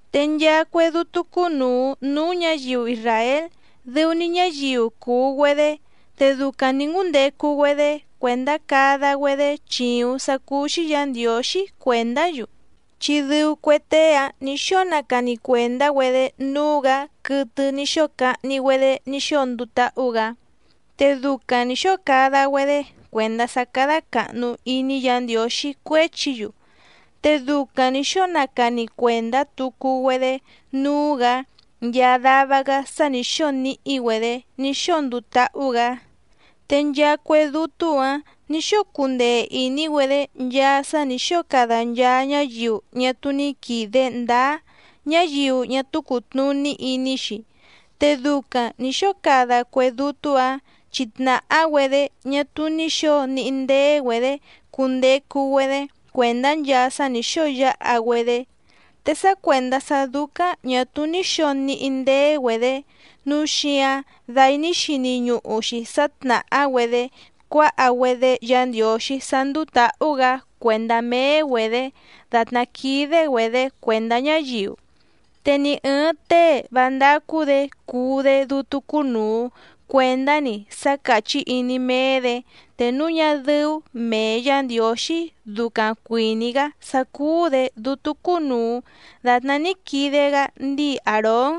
Te nchaa cue dútú cúnùu núú ñǎyiu isràél dɨu‑ni ñáyiu cùu‑güedé, te ducaⁿ nǐ ngúndecu‑güedé cuèndá cada‑güedé chìuⁿ sá cúú‑xí Yǎ Ndiǒxí cuèndá‑yu, chi dɨu cue tée‑áⁿ nǐ xóo nacani cuèndá‑güedé núú‑gǎ quɨtɨ ní xóo cahni‑güedé ní xóo nduu táhú‑gǎ, te ducaⁿ nǐ xóo cada‑güedé cuèndá sá cádá càhnu iní Yǎ Ndiǒxí cuéchi‑yu, te ducaⁿ nǐ xóo nacani cuèndá tucu‑güedé núú‑gǎ nchaa dava‑gá sá nǐ xóo níhí‑güedě ní xóo nduu táhú‑gǎ. Te nchaa cue dútú‑ǎⁿ nǐ xóo cundee ìní‑güedé nchaa sá nǐ xóo cada nchaa ñáyiu ñá túú ní quìde ndáá ñáyiu ñá túú cùtnuní iní‑xi, te ducaⁿ nǐ xóo cada cue dútú‑ǎⁿ chi tnàhá‑güedé ñá túú ní xǒo níhí ndéé‑güedě cundecu‑güedé cuèndá nchaa sá nǐ xóo yáha‑güedé. Te sá cuèndá sá dúcáⁿ ñà túú ní xǒo níhí ndéé‑güedě nǔu xíǎⁿ dai ní xini ñuhu‑xi sá tnàhá‑güedé cuáha‑güedé Yǎ Ndiǒxí sá ndúú tǎhú‑gǎ cuèndá méé‑güedě dàtná quídé‑güedě cuèndá ñáyiu. Te ni ɨ̀ɨⁿ tée vá ndácú‑dě cuu‑dé dútú cúnùu cuendá‑ni sá càchí iní méé‑dě te núu ñá dɨ́ú mèe Yá Ndiǒxí ducaⁿ cuìní‑gá sá cúú‑dě dútú cúnùu datná ní quide‑gá ndíi Àrón.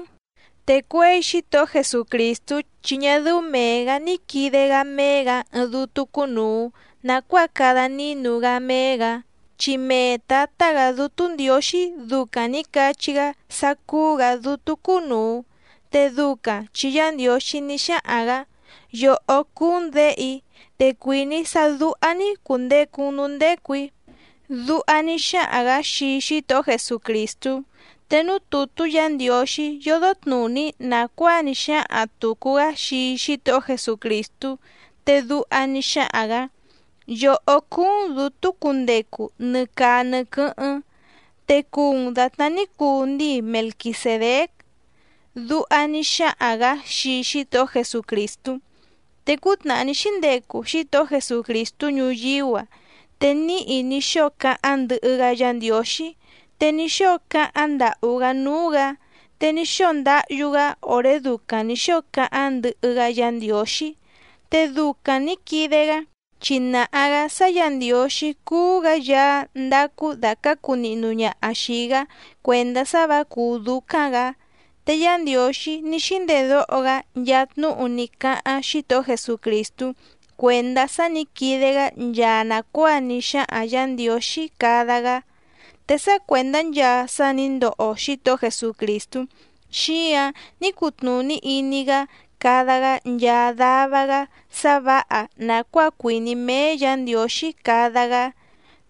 Te cuěi Xítohó Jesucrìstú chi ñá dɨ́ú mèe‑gá ní quìde‑gá méé‑gǎ ɨɨⁿ dútú cúnùu nacuáa cada nínu‑gá méé‑gǎ, chi mee Tǎtá‑gǎ Dútú Ndiǒxí ducaⁿ nǐ cachí‑gá sá cúú‑gǎ Dútú cúnùu, te ducaⁿ chi Yá Ndiǒxí ní xáhaⁿ‑gǎ: Yòhó cúú‑n Děhe‑í, te cuìní‑í sá dúhá‑ní cùndecu‑n núú ndécù‑í. Duha ní xáhaⁿ‑gǎ xii Xítohó Jesucrìstú. Te núú tùtú Yǎ Ndiǒxí yódó tnùní nàcuáa ní xáhaⁿ tùcu‑gá xii Xítohó Jesucrìstú, te duha ní xáhaⁿ‑gǎ: Yòhó cúú‑n dǔtú cundecu nɨ caa nɨ quɨ́hɨ́ⁿ, te cùu‑n datná ní cuu ndíi Melquisèdéc. Duha ní xáhaⁿ‑gǎ xii Xítohó Jesucrìstú. Te cútnàhá ní xíndecu Xítohó Jesucrìstú ñuyíú‑a te níhi ní xóo cáháⁿ ndɨhɨ‑gá Yǎ Ndiǒxí te ní xóo cáháⁿ ndàhú‑gá núú‑gǎ, te ní xóo ndáhyú‑gá òré ducaⁿ nǐ xóo cáháⁿ ndɨhɨ‑gá Yǎ Ndiǒxí, te ducaⁿ nǐ quide‑gá chi nàha‑gá sá Yǎ Ndiǒxí cúú‑gǎ Yaá ndacu dàcácu nihnu ñaha xìi‑gá cuèndá sá vǎ cùú dúcáⁿ‑gǎ. Te Yá Ndiǒxí ní xíndedóho‑gá nchaa tnúhu ní cáháⁿ Xítohó Jesucrìstú cuèndá sá nǐ quide‑gá nchaa nàcuáa ní xáhaⁿ Yǎ Ndiǒxí cada‑gá. Te sá cuèndá nchaa sá nǐ ndoho Xítohó Jesucrìstú xíǎⁿ ní cutnùní iní‑gá cada‑gá nchaa dava‑gá sá vǎha nàcuáa cuìní méé Yǎ Ndiǒxí cada‑gá.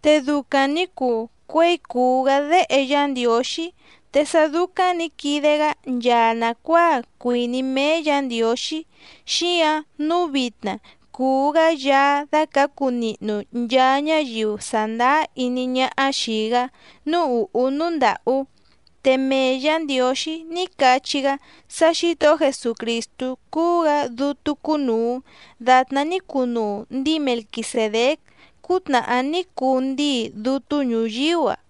Te ducaⁿ nǐ cuu cuěi cùu‑gá Déhe Yá Ndiǒxí. Te sá dúcáⁿ nǐ quide‑gá nchaa nàcuáa cuìní méé Yǎ Ndiǒxí, xíǎⁿ nǔu vitna cùu‑gá Yaá dácǎcu nihnu nchaa ñáyiu sàndáá iní ñáhá xìi‑gá núú ùhú núú ndàhú. Te mee Yǎ Ndiǒxí ní cachí‑gá sá Xǐtohó Jesucrìstú cúú‑gǎ dútú cúnùu datná ní cunuu ndíi Melquisèdéc cútnàhá ní cuu ndíi dútú ñuyíú‑a.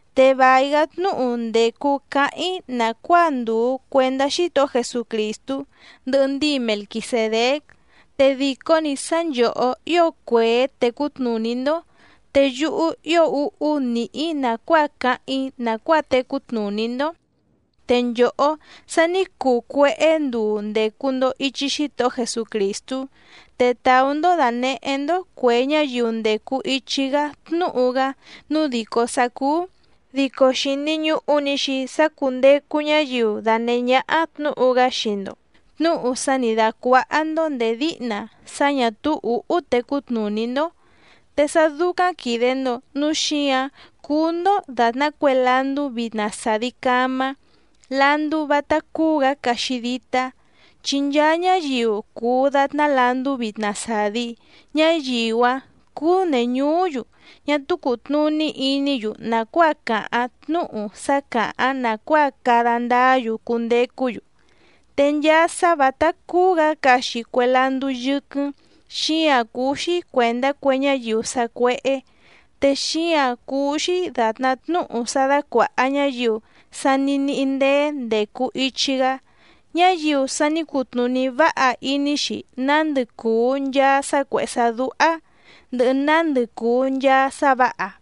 Te vài‑gá tnúhu ndècu cáháⁿ‑í nàcuáa ndùu cuendá Xítohó Jesucrìstú, ndɨhɨ ndíi Melquisèdéc, te dìcó‑ni sá nchòhó ío cuèé tècú tnùní‑ndó, te yúhú ío úhú nìhí‑í nàcuáa cáháⁿ‑í nàcuáa tecú tnùní‑ndó. Te nchòhó sa ní cuu cuéhé nduu ndècu‑ndo ichi Xítohó Jesucrìstú, te tàú‑ndó dànehé‑ndó cuè ñáyiu ndècu ichi‑gá tnúhu‑gá nǔu dìcó sá cúú, dico xìni ñuhu‑ni‑xi sá cúndècu ñáyiu danèhé ñáhá tnǔhu‑gá xii‑ndo, tnúhu sá nǐ dácuáhá‑ndó nděé díhna sá ñà túú ǔhú tecú tnùní‑ndó. Te sá dúcáⁿ quìde‑ndo núu xíǎⁿ cúú‑ndó dàtná cue landú vitna sàdi camá, landú vátá cúú‑gǎ caxi dítá. Chi nchaa ñáyiu cùu datná landú vitna sàdi, ñáyiu‑áⁿ cúú nèñuú‑yu ñá túú cùtnuní iní‑yu nàcuáa càháⁿ tnúhu sá càháⁿ nàcuáa cada ndáá‑yu cundecú‑yu. Te nchaa sá vǎtá cúú‑gǎ caxi cue landú yɨ́quɨ́ⁿ xíǎⁿ cúú‑xí cuèndá cue ñáyiu sacuéhé, te xíǎⁿ cúú‑xí dàtná tnúhu sá dácuàha ñáyiu sa ní níhí ndéé ndècu ichi‑gá, ñáyiu sa ní cutnùní váha iní‑xi nándɨ cùu nchaa sá cuèhé sá dúhá, ndɨhɨ nándɨ cùu nchaa sá vǎha.